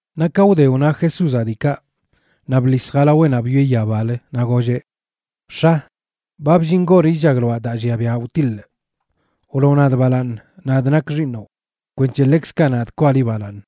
Naꞌ ka wde wna Jesúzaꞌ diikaꞌ, naꞌ bḻis jalaweꞌnaꞌ bwieꞌ yabalə, naꞌ golleꞌ: ―X̱a, ba bllin gor illagloaꞌ daa llia biaꞌ wtiḻꞌ. Wloo nadꞌ balaaṉ, nadꞌ nakꞌ xiiṉoꞌ, kwenc̱he ḻekzkaꞌ nadꞌ kwaa liꞌ balaaṉ.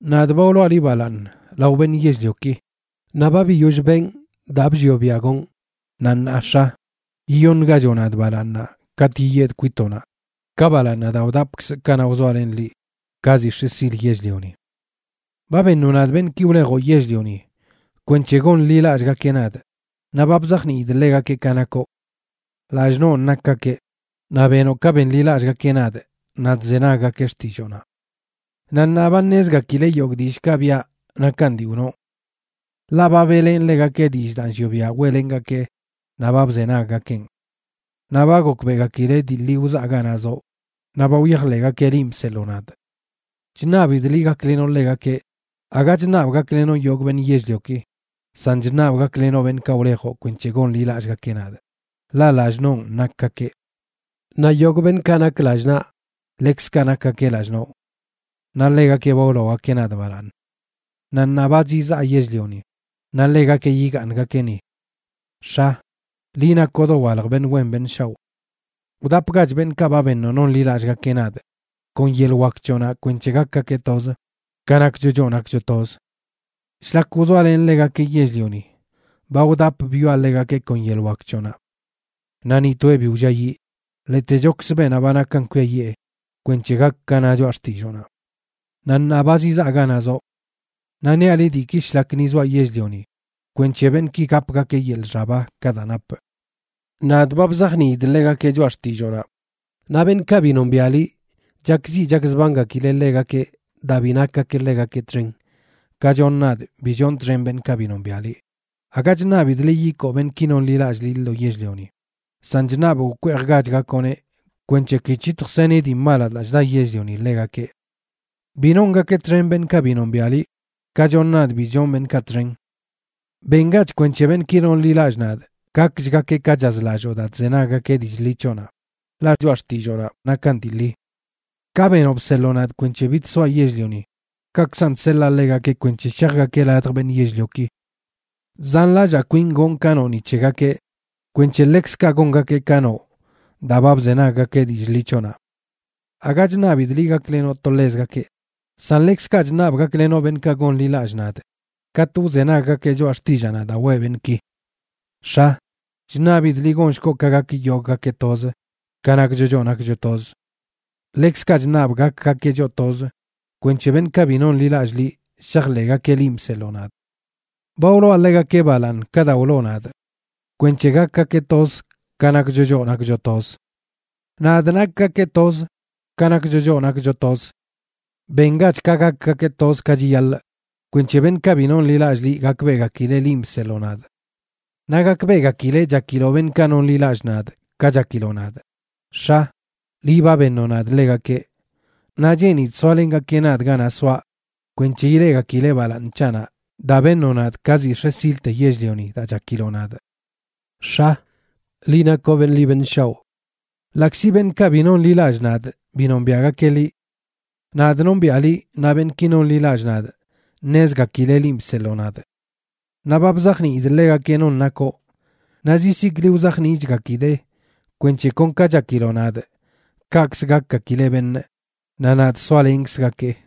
’Nadꞌ ba wloꞌa liꞌ balaaṉ lao beṉꞌ yell-lioki, naꞌ ba biyoll benꞌ daa bllioꞌ biaꞌ gonꞌ. Naꞌ ṉaa, X̱a, yiyoṉgachoꞌ nadꞌ balaaṉnaꞌ katꞌ yiyedꞌ kwitoꞌnaꞌ ka balaaṉnaꞌ daa wdapkzꞌ kanaꞌ wzoalenꞌ liꞌ ka ziꞌ x̱e sil yell-lioni. ’Ba beṉoꞌ nadꞌ beṉꞌki wlejoꞌ yell-lioni kwenc̱he gonḻilallꞌgakeꞌ nadꞌ, naꞌ ba bzajniidꞌ ḻegakeꞌ ka nakoꞌ. Lallꞌ nonꞌ nakgakeꞌ, naꞌ benoꞌ ka benḻilallꞌgakeꞌ nadꞌ naꞌ chzenaggakeꞌ xtilloonaꞌ. Naꞌ ṉaa ba ṉezgakileꞌ yogꞌ dillꞌkaꞌ biꞌa nakan dii wnoꞌ. Ḻaꞌ ba beꞌlenꞌ ḻegakeꞌ dillꞌ daa nllioꞌ biaꞌ weꞌlengakee naꞌ ba bzenaggakeꞌn. Naꞌ ba gokbeꞌgakileꞌ dii ḻi wzaa ganaꞌ zoꞌ naꞌ ba wyajḻeꞌgakeꞌ linꞌ bseḻoo nadꞌ. ’Chṉabidꞌ liꞌ gaklenoꞌ ḻegakeꞌ. Aga chṉabꞌ gaklenoꞌ yogꞌ beṉꞌ yell-lioki, san chṉabꞌ gaklenoꞌ beṉꞌkaꞌ wlejoꞌ kwenc̱he gonḻilallꞌgakeꞌ nadꞌ, ḻaꞌ lallꞌ nonꞌ nakgakeꞌ. Naꞌ yogꞌ beṉꞌkaꞌ nak lallꞌ naꞌ ḻekzkaꞌ nakgakeꞌ lallꞌ noꞌ. Naꞌ ḻegakeꞌ ba wloogakeꞌ nadꞌ balaaṉ. ’Naꞌ ṉaa ba chizaꞌ yell-lioni. Naꞌ ḻegakeꞌ yigaaṉgakeꞌ ni. X̱a, liꞌ nakoꞌ dowalj beṉꞌ wen beṉꞌ shaoꞌ. Wdapgach beṉꞌkaꞌ ba beṉoꞌ nonḻilallꞌgakeꞌ nadꞌ kon yeḻꞌ wak c̱hoꞌnaꞌ kwenc̱he gakgakeꞌ toz, ka nakcho choꞌ nakcho toz. Shlak wzoalenꞌ ḻegakeꞌ yell-lioni ba wdap bwiaꞌ ḻegakeꞌ kon yeḻꞌ wak c̱hoꞌnaꞌ. Naꞌ ni toeꞌ bi wlliayiꞌ, ḻetechokzə beenaꞌ ba nakan kwiayee, kwenc̱he gak ka na Choꞌa Xtilloonaꞌ. ’Naꞌ ṉaa ba zizaa ganaꞌ zoꞌ. Naꞌ niaꞌ liꞌ diiki shlak ni zoaꞌ yell-lioni kwenc̱he beṉꞌki gapgakeꞌ yeḻꞌ xaba ka daa napꞌ. Nadꞌ ba bzajniidꞌ ḻegakeꞌ choꞌa xtilloonaꞌ, naꞌ beṉꞌkaꞌ bi nombiaꞌ liꞌ chakziꞌ chakzbangakileꞌ ḻegakeꞌ daa bi nakgakeꞌ ḻegakeꞌ txen, ka chonꞌ nadꞌ bi chonꞌ txen beṉꞌkaꞌ bi nombiaꞌ liꞌ. Aga chṉabidꞌ liꞌ yikoo beṉꞌki nonḻilallꞌ liꞌ lo yell-lioni, san chṉabꞌ wkweejgachgakoꞌneꞌ kwenc̱he ki c̱hitj seni dii malaꞌ daa chda yell-lioni ḻegakeꞌ. Bi nongakeꞌ txen beṉꞌkaꞌ bi nombiaꞌ liꞌ, ka chonꞌ nadꞌ bi chonꞌ beṉꞌkaꞌ txen. Bengach kwenc̱he beṉꞌki nonḻilallꞌ nadꞌ gakchgakeꞌ ka chazlalloo daa chzenaggakeꞌ dillꞌ ḻi c̱hoꞌnaꞌ, ḻaꞌ choꞌa xtilloonaꞌ nakan dii ḻi. Ka benoꞌ bseḻoo nadꞌ kwenc̱he bidsoaꞌ yell-lioni, kaꞌkzan chseḻaa ḻegakeꞌ kwenc̱he shajgakeꞌ ladj beṉꞌ yell-lioki. Chzanlallaa kwinꞌ gonꞌ ka noꞌ ni c̱hegakeꞌ, kwenc̱he ḻekzkaꞌ gongakeꞌ ka noꞌ daa ba chzenaggakeꞌ dillꞌ ḻi c̱hoꞌnaꞌ. ’Aga chṉabidꞌ liꞌ gaklenoꞌ to ḻezgakeꞌ, san ḻekzkaꞌ chṉabꞌ gaklenoꞌ beṉꞌkaꞌ gonḻilallꞌ nadꞌ katꞌ wzenaggakeꞌ choꞌa xtillaanaꞌ daa weꞌ beṉꞌki. X̱a, chṉabidꞌ liꞌ gonshgoꞌ ka gak yogꞌgakeꞌ toz, ka nakcho choꞌ nakcho toz. Ḻekzkaꞌ chṉabꞌ gakgakeꞌ choꞌ toz kwenc̱he beṉꞌkaꞌ bi nonḻilallꞌ liꞌ shajḻeꞌgakeꞌ linꞌ bseḻoo nadꞌ. Ba wloꞌa ḻegakeꞌ balaaṉ ka daa wloo nadꞌ, kwenc̱he gakgakeꞌ toz ka nakcho choꞌ nakcho toz. Nadꞌ nakgakee toz ka nakcho choꞌ nakcho toz. Bengach ka gakgakeꞌ toz ka chiyaḻꞌ, kwenc̱he beṉꞌkaꞌ bi nonḻilallꞌ liꞌ gakbeꞌgakileꞌ linꞌ bseḻoo nadꞌ, naꞌ gakbeꞌgakileꞌ chakiloꞌ beṉꞌkaꞌ nonḻilallꞌ nadꞌ ka chakiloꞌ nadꞌ. ’X̱a, liꞌ ba beṉoꞌ nadꞌ ḻegakeꞌ, naꞌ cheenidꞌ soalengakeꞌ nadꞌ ganaꞌ soaꞌ kwenc̱he ileꞌgakileꞌ balaaṉ c̱haꞌnaꞌ daa beṉoꞌ nadꞌ ka ziꞌ x̱e silte yell-lioni daa chakiloꞌ nadꞌ. X̱a, liꞌ nakoꞌ beṉꞌ ḻi beṉꞌ shaoꞌ. Ḻaꞌkzi beṉꞌkaꞌ bi nonḻilallꞌ nadꞌ bi nombiaꞌgakeꞌ liꞌ, nadꞌ nombiꞌa liꞌ naꞌ beṉꞌki nonḻilallꞌ nadꞌ ṉezgakileꞌ linꞌ bseḻoo nadꞌ. Naꞌ ba bzajniidꞌ ḻegakeꞌ non nakoꞌ, naꞌ zizikli wzajniꞌchgakidee kwenc̱he kon ka chakiloꞌ nadꞌ kaꞌkzə gakgakileꞌ beṉꞌ, naꞌ nadꞌ soalenkzgakee.